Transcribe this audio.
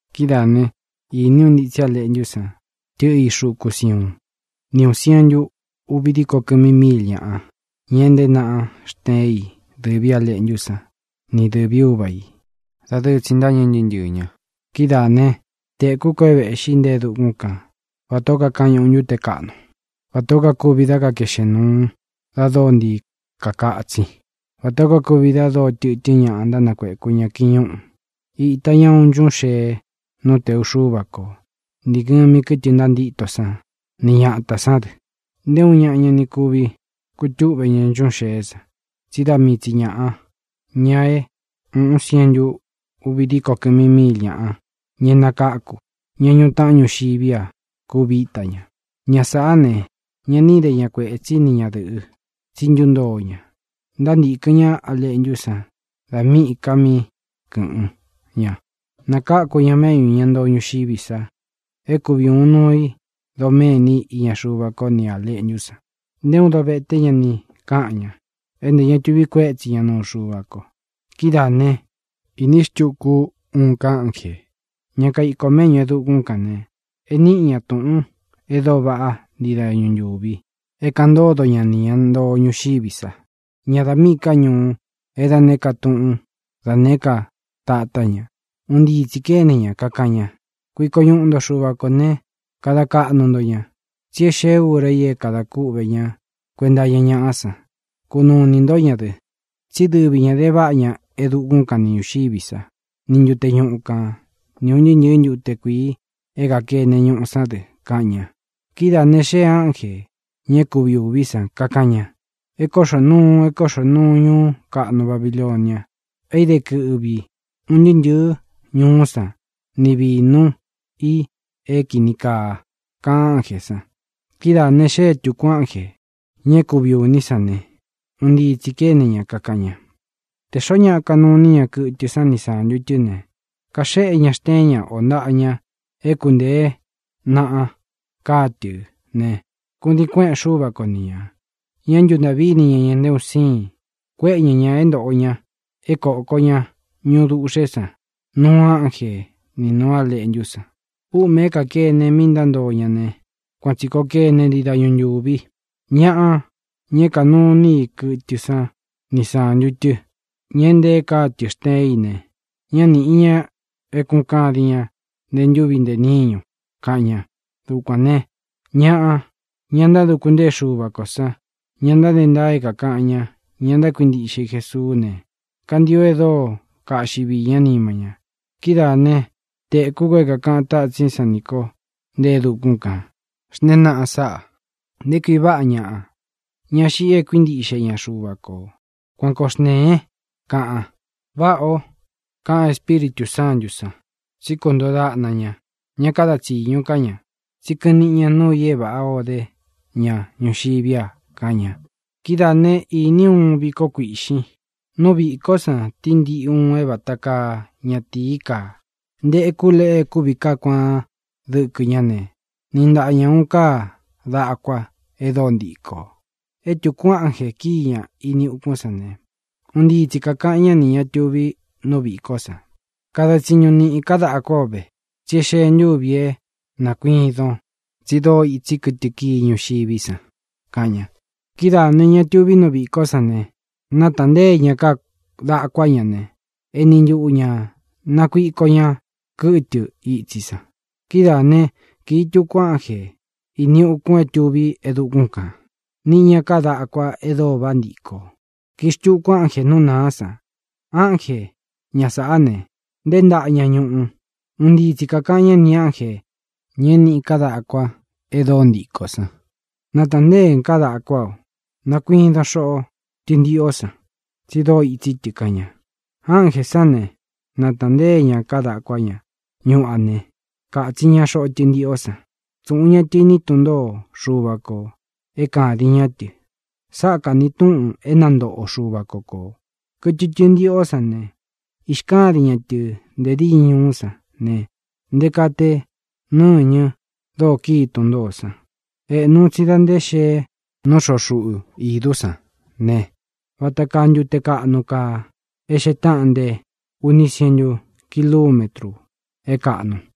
Kidáā né, īní u ntitsi A Leꞌntú san tɨꞌɨ í xuku Siuún, ni ūun sientu uvi díko kɨmi míil ñaꞌa, ña é ntēé naꞌa xteen i dɨ̄ví A Leꞌntú san ni dɨ̄ví Uva ī. Dadɨɨ tsi ntâñɨ ntɨɨ́ ntɨɨ̄ ña. Kidáā né, tēkú ko é vēꞌxí nte e dukún kan vatā ó kakañuꞌu ntúte kaꞌnu, vatā ó kuvi dá kakēꞌxén nuu da dóo ntii kakatsin, vatā ó kuvi da dóo tɨtɨ́n ñaꞌa ntánakueku ña kiñúꞌū. Īta ña uun nchuꞌún xee nú tēu Xúva ko, nī ngɨmi kɨ́tɨ ntantíto sán ni ñatā sán dɨ. Nté uun ñaꞌa ña ni kuvi kutúꞌve ña nchuꞌún xeé san, tsí da mii tsi ñāꞌa, ña é uun sientu uvi díko kɨmi míil ñaꞌa, ña é nakáku, ña ñuꞌu taꞌan ñuxiví a, kuvi íta ña. Ña sāꞌá ne, ña ni íde ña kuētsí ni ñadɨ̄ꞌɨ, tsi ntúntoo ña. Ntántīkɨn ñá A Leꞌntú san da míꞌī ka mí kɨ̄ꞌɨn ña. Nakáku ña méꞌñū ña ntoo ñuxiví sa é kuvi ūun nuu i doméni iña Xuva ko nī A Leꞌntú san. Nté uun dovete ña ni káꞌan ña, é ntē ña tuvi kuétsi ña nūu Xuva ko. Kidáā né, īní xtuku ú uun ká ánjē, ña kaiko mēꞌñú e dukún kān ne, e níꞌi ñā túꞌūn e dóo vaꞌá ntii dañu ntūvi é kāꞌan ntodo ñá nī ña ntoo ñuxiví sa, ña dā míꞌī ká ñuu, é da nēé ka tuꞌún, da nēé ka tatá ña. Un ntii tsī kéne ña, kakaꞌan ña: —Kuiko ñuꞌu nto Xuva kō ne, kada kaꞌnu nto ña. Tsí e xée ura i é kadā kúꞌvē ñá kuenta iña ñaꞌá san. Kunuu inī ntó ña dɨ, tsí dɨvi ñā de váꞌa ña e dukún kan ni ñūxiví sa, ni ntute ñuꞌu kān, ni ūn ntɨɨ́ ntɨ̄ɨ́ ntute kuīi é kākene ñuꞌu sán dɨ —kaꞌan ña. Kidáā ne, xéē ánjē, ña é kuvi ūví san, kakaꞌan ña: —¡E kóꞌxō nuu, e kóꞌxō nuu ñuú kaꞌnu Babilonia, é īde kɨꞌvi un ntɨɨ́ ntɨ̄ɨ́ ñuú san ni vīnu i é kīni kaa! —kaꞌan ánjē san. Kídaā ne, xée tūku ánjē, ña é kuvi ūní san ne, un ntii tsī kéne ña, kakaꞌan ña: —Tē xoó ñaꞌa kanuu iní ña kɨtɨ san ni sántu tɨ́ ne, kaxéꞌe ña xteén ña ō ntaꞌa ña é kuntēé naꞌa káa tɨ̄ ne, kudiin kuéꞌen Xúva ko ni ñā. Ñá ntuntāꞌví ini ña ñā nté un síin. Kuéꞌe ña ñā é ntōꞌo ña é kōko ña ñuꞌu duꞌxe san nuu ánje ni nūú A Leꞌntú san. Úꞌmē é kākene mi ntántoꞌo ña ne, kuan tsī koo kené ntii dañu ntūvi. Ñaꞌa, ña é kānuu iní i kɨtɨ san ni sántu tɨ́, ña é ntēe káa tɨ̄ xteen í ne, ñá nīꞌi ña é kūꞌun kadin ñá ntē ntúvi ntē níñu —kaꞌan ña. Dukuān né, ñaꞌa, ña ntáduku ntée Xuva kō san, ña ntáde ntaa é kākaꞌan ña, ña ntákuintiꞌxe i Jesuu ne, kantio e dóo kaꞌxi vii ñá nima ña. Kidáā né, tēkú ko é kākaꞌan tatsín san nī ko nte e dukún kān: —Xntēén naꞌan sáꞌā: “Nté kui váꞌa ñaꞌa, ña xiꞌi e kuíntiꞌxe ña Xuva kō.” Kuan koo xntēen —kaꞌan. —Váꞌā ó —kaꞌan Espíritū Sántū san—, tsí kuntoo daꞌna ña; ña káda tsīñu ká ña, tsí kɨꞌɨn níꞌi ña nuu i é vāꞌá ō dé ña ñuxiví a —kaꞌan ña. Kidáā né, īní u uun viko kuiꞌxin. Nú vīkó san tíntiꞌi uun é vata kaa ñatīí kaa. Ntekú leꞌe e kúvi kaá kuaan dɨkɨ ñá ne, niꞌi ntaꞌa ña ūun káa dakua e dóo ntikō. É tūku ánjē kíi ña ini ukún san ne, un ntii tsi kākaꞌan ñá nī ña tuví nú vīkó san: —¡Kadan tsiñun niꞌin káa dakuá o ve! tsí e xée ntūvi é nakuidon, tsi dóo itsi kɨtɨ kii ñuxiví san —kaꞌan ña. Kidáā ne, ña é tuví nú vīkó san ne, nátāntée ña káa dakuá ña ne, eni ntuꞌu ñā nákuido ña kɨtɨ ītsí san. Kidáā né, kīi tuku ánjē ini ukun é tuví e dukún kān, niꞌi ña káa dakua e dóo váꞌa ntikō. Kīi xtuku ánjē nú nāá san. Ánje, ña sāꞌá ne, nteé ntaꞌa ña ñuꞌu. Un ntii tsi kākaꞌan ñá nī ánjē, ña é niꞌi káa dakua e dóo ntikō san: —¡Natāntéen káa dakuá o! Nakuidon xoꞌo tɨntiꞌō san, tsi dóo itsí tɨ —kaꞌan ña. Ánjē sán ne, nátāntée ña káa dakuá ña ñuꞌu a ne, kātsin ña xoꞌo tɨntiꞌó san. Tsūꞌun ña tɨ iní tun ntōó Xuva kō é kādin ñá tɨ. Sáꞌa kāni túꞌun é nantoꞌo Xuva ko kō. Kɨtɨ tɨntiꞌó san ne, īxkádin ña tɨ̄ nte díñɨ ñuú san ne, nté kaa te nɨñɨ dóo kíi tun ntōó san. Ēꞌnu un tsi da nté xēe nú xoꞌo xuꞌu idú san ne, vata kaa ntute kaꞌnu kaa e xee táꞌan nte uni sientu kilumétru é kāꞌnu.